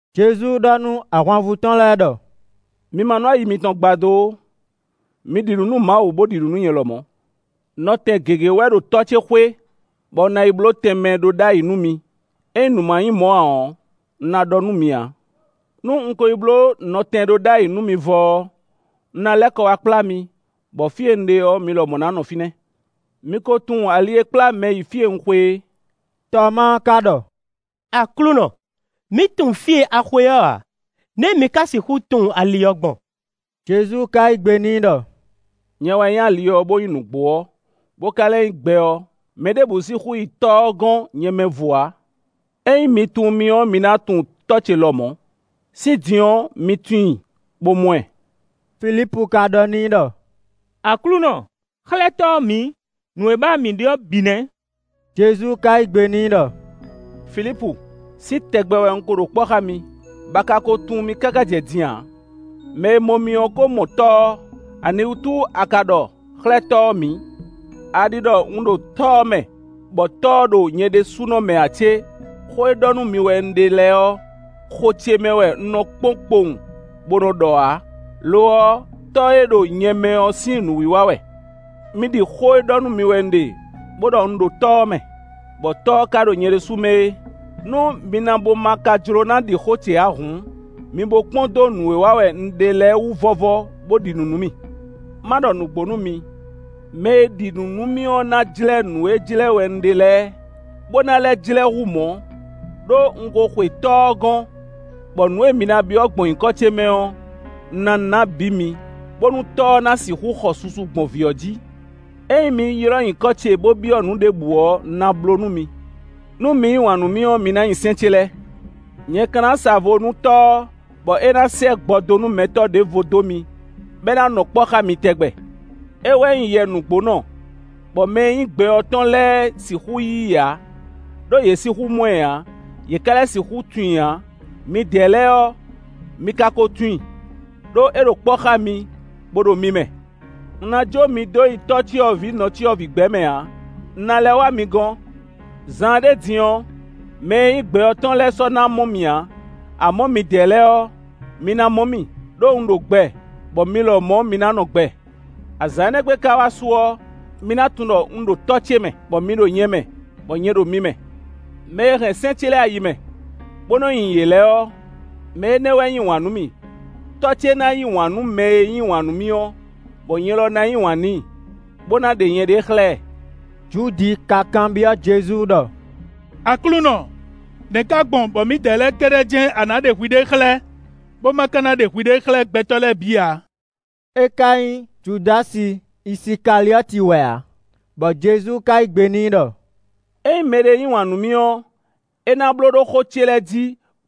Jezu ɖɔ nú ahwanvú tɔn lɛ́ɛ ɖɔ: “Mi ma nú ayi mitɔn gbadó ó. Mi ɖi nǔ nú Mawu, bó ɖi nǔ nú nyɛ lɔmɔ̌. Nɔtɛn gěgé wɛ ɖo Tɔ́ ce xwé bɔ un ná yi bló tɛnmɛ ɖó ɖ'ayǐ nú mi; ényí nǔ ma nyí mɔ̌ ǎ ɔ́, un ná ɖɔ nú mi ǎ. Nú un ko yi bló nɔtɛn ɖó ɖ'ayǐ nú mi vɔ ɔ́, un ná lɛ́ kɔ wá kplá mi, bɔ fí e un ɖe ɔ́, mi lɔmɔ̌ ná nɔ fínɛ́. Mi ko tunwun ali e kplá mɛ yi fí e un xwe é.” Tɔmáa ka ɖɔ: “Aklúnɔ, mǐ tunwun fí e a xwe ɔ́ ǎ, nɛ̌ mǐ ka sixú tunwun ali ɔ́ gbɔn?” Jezu ka yí gbe n'i ɖɔ: “Nyɛ wɛ nyí ali ɔ́, bó nyí nǔgbó ɔ́, bó ka lɛ́ nyí gbɛ ɔ́. Mɛɖěbǔ sixú yi Tɔ́ ɔ́ gɔ́n nyɛ mɛ vo ǎ. Ényí mi tunwun mì ɔ́, mi ná tunwun Tɔ́ ce lɔmɔ̌; sín din ɔ́, mi tunwun i, bó mɔ ɛ.” Filípu ka ɖɔ n'i ɖɔ: “Aklúnɔ, xlɛ́ Tɔ́ ɔ́ mǐ; nǔ e ba wɛ mǐ ɖe ɔ́ bǐ nɛ́.” Jezu ka yí gbe n'i ɖɔ: “Filípu, sín tɛgbɛ wɛ un ko ɖo kpɔ́ xá mi, bɔ a ka ko tunwun mì káká jɛ din ǎ. Mɛ e mɔ mì ɔ́ ko mɔ Tɔ́ ɔ́; aniwútu a ka ɖɔ: ‘Xlɛ́ Tɔ́ ɔ́ mǐ?’ A ɖi ɖɔ un ɖo Tɔ́ ɔ́ mɛ, bɔ Tɔ́ ɔ́ ɖo nyɛ ɖésúnɔ mɛ ǎ cé? Xó e ɖɔ nú mi wɛ un ɖe lɛ́ɛ ɔ́, xo ce mɛ wɛ un nɔ kpɔ́n kpowun, bó nɔ́ ɖɔ ǎ; lo ɔ́, Tɔ́ e ɖo nyɛ mɛ ɔ́ sín nǔwiwa wɛ. Mi ɖi xó e ɖɔ nú mi wɛ un ɖe, bó ɖɔ: un ɖo Tɔ́ ɔ́ mɛ, bɔ Tɔ́ ɔ́ ka ɖo nyɛ ɖésú mɛ é. Nú mi na bo ma ka jló ná ɖi xó ce ǎ hǔn, mi bo kpɔ́n dó nǔ e wa wɛ un ɖe lɛ́ɛ wú vɔ́vɔ́, bó ɖi nǔ nú mì. Ma ɖɔ nǔgbó nú mi: mɛ e ɖi nǔ nú mì ɔ́ ná jlɛ́ nǔ e jlɛ́ wɛ un ɖe lɛ́ɛ, bó ná lɛ́ jlɛ́ hú mɔ̌; ɖó un ko xwe Tɔ́ ɔ́ gɔ́n. Bɔ nǔ e mi na byɔ́ gbɔn nyǐkɔ ce mɛ ɔ́, un ná ná bǐ mi, bónú Tɔ́ ɔ́ ná sixú xɔ susu gbɔn Vǐ ɔ́ jí. Ényí mi ylɔ́ nyǐkɔ ce, bó byɔ́ nǔ ɖěbǔ ɔ́, un ná bló nú mi.” “Nú mi yí wǎn nú mì ɔ́, mi ná nyi sɛ́n ce lɛ́ɛ. Nyɛ ka ná sa vo nú Tɔ́ ɔ́, bɔ é ná sɛ́ gbɔdónúmɛtɔ́ ɖěvo dó mi, bɔ é ná nɔ kpɔ́ xá mi tɛgbɛ. Éyɛ́ wɛ nyí Yɛ nǔgbónɔ, bɔ mɛ e nyí gbɛ ɔ́ tɔn lɛ́ɛ sixú yí i ǎ; ɖó yě sixú mɔ ɛ ǎ; yě ká lɛ́ sixú tunwun i ǎ. Midɛɛ lɛ́ɛ ɔ́, mi ka ko tunwun i, ɖó é ɖo kpɔ́ xá mi, bó ɖo mi mɛ. “Un ná jǒ mi dó nyi tɔ́cyɔvǐ nɔcyɔvǐ gbɛ mɛ ǎ; un ná lɛ́ wá mi gɔ́n. Zaanɖé din ɔ́, mɛ e nyí gbɛ ɔ́ tɔn lɛ́ɛ sɔ́ ná mɔ mì ǎ; amɔ̌, midɛɛ lɛ́ɛ ɔ́, mi ná mɔ mì; ɖó un ɖo gbɛ, bɔ mi lɔmɔ̌ mi ná nɔ gbɛ. Azǎn énɛ́ gbe ka wá su ɔ́, mi na tunwun ɖɔ un ɖo Tɔ́ ce mɛ, bɔ mi ɖo nyɛ mɛ, bɔ nyɛ ɖo mi mɛ. “Mɛ e hɛn sɛ́n ce lɛ́ɛ ayi mɛ, bó nɔ́ nyi yě lɛ́ɛ ɔ́, mɛ énɛ́ wɛ yí wǎn nú mì. Tɔ́ ce ná yí wǎn nú mɛ e yí wǎn nú mì ɔ́, bɔ nyɛ lɔ ná yí wǎn n'i, bó ná ɖe nyɛɖée xlɛ́ ɛ.” Judi ka kanbyɔ́ Jezu ɖɔ: “Aklúnɔ, nɛ̌ ka gbɔn bɔ mǐdɛɛ lɛ́ɛ kɛ́ɖɛ́ jɛ́n a nǎ ɖe hwiɖée xlɛ́, bó ma ka ná ɖe hwiɖée xlɛ́ gbɛtɔ́ lɛ́ɛ bǐ ǎ?” (É ka nyí Judási Isikaliɔ́ti wɛ ǎ). Bɔ Jezu ka yí gbe n'i ɖɔ: “Ényí mɛɖé yí wǎn nú mì ɔ́, é ná bló ɖó xó ce lɛ́ɛ jí,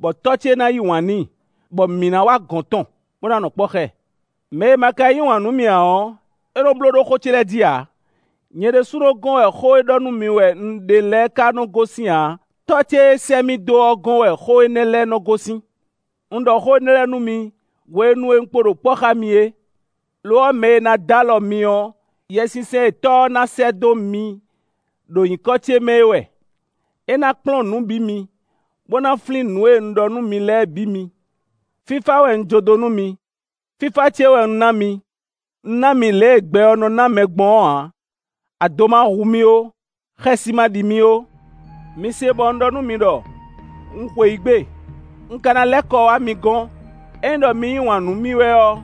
bɔ Tɔ́ ce na yí wǎn n'i, bɔ mǐ ná wá gɔ̌n tɔn, bó ná nɔ kpɔ́ xá ɛ. Mɛ e ma ka yí wǎn nú mì ǎ ɔ́, é nɔ bló ɖó xó ce lɛ́ɛ jí ǎ. Nyɛ ɖésúnɔ gɔ́n wɛ xó e ɖɔ nú mi wɛ un ɖe lɛ́ɛ ka nɔ gosín ǎ, Tɔ́ ce e sɛ́ mì dó ɔ́ gɔ́n wɛ xó énɛ́ lɛ́ɛ nɔ gosín. “Un ɖɔ xó énɛ́ lɛ́ɛ nú mi, hwenu e un kpo ɖo kpɔ́ xá mi é. Lo ɔ́, mɛ e ná d'alɔ mi ɔ́, Yɛsinsɛn e Tɔ́ ɔ́ ná sɛ́ dó mi ɖo nyǐkɔ ce mɛ é wɛ; é ná kplɔ́n nǔ bǐ mi, bó ná flín nǔ e un ɖɔ nú mi lɛ́ɛ bǐ mi. “Fífá wɛ un jó dó nú mi; fífá ce wɛ un ná mi. Un ná mi lě e gbɛ ɔ́ nɔ ná mɛ gbɔn ɔ́ ǎ; ado ma hu mi ó; xɛsi ma ɖi mi ó. Mi se bɔ un ɖɔ nú mi ɖɔ: ‘Un xweyǐgbe; un ka ná lɛ́ kɔ wá mi gɔ́n.’ Ényí ɖɔ mi yí wǎn nú mì wɛ ɔ́,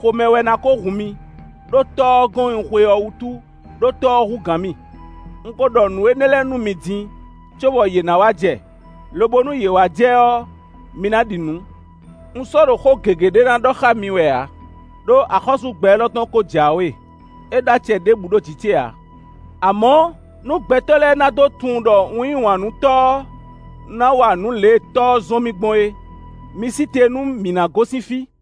xomɛ wɛ ná ko hun mi, ɖó Tɔ́ ɔ́ gɔ́n e un xwe ɔ́ wútu, ɖó Tɔ́ ɔ́ hú gǎn mì. Un ko ɖɔ nǔ énɛ́ lɛ́ɛ nú mi din, cóbɔ yě ná wá jɛ, lobo nú yě wá jɛ ɔ́, mi ná ɖi nǔ. Un sɔ́ ɖo xó gěgé ɖé ná ɖɔ xá mi wɛ ǎ, ɖó axɔ́sú gbɛ élɔ́ tɔn ko jǎwe; é ɖó acɛ ɖěbǔ ɖo jǐ ce ǎ. Amɔ̌, nú gbɛtɔ́ lɛ́ɛ ná dó tunwun ɖɔ un yí wǎn nú Tɔ́ ɔ́, un ná wa nǔ lě e Tɔ́ ɔ́ zɔ́n mì gbɔn é; mi sí te nú mǐ ná gosín fí.”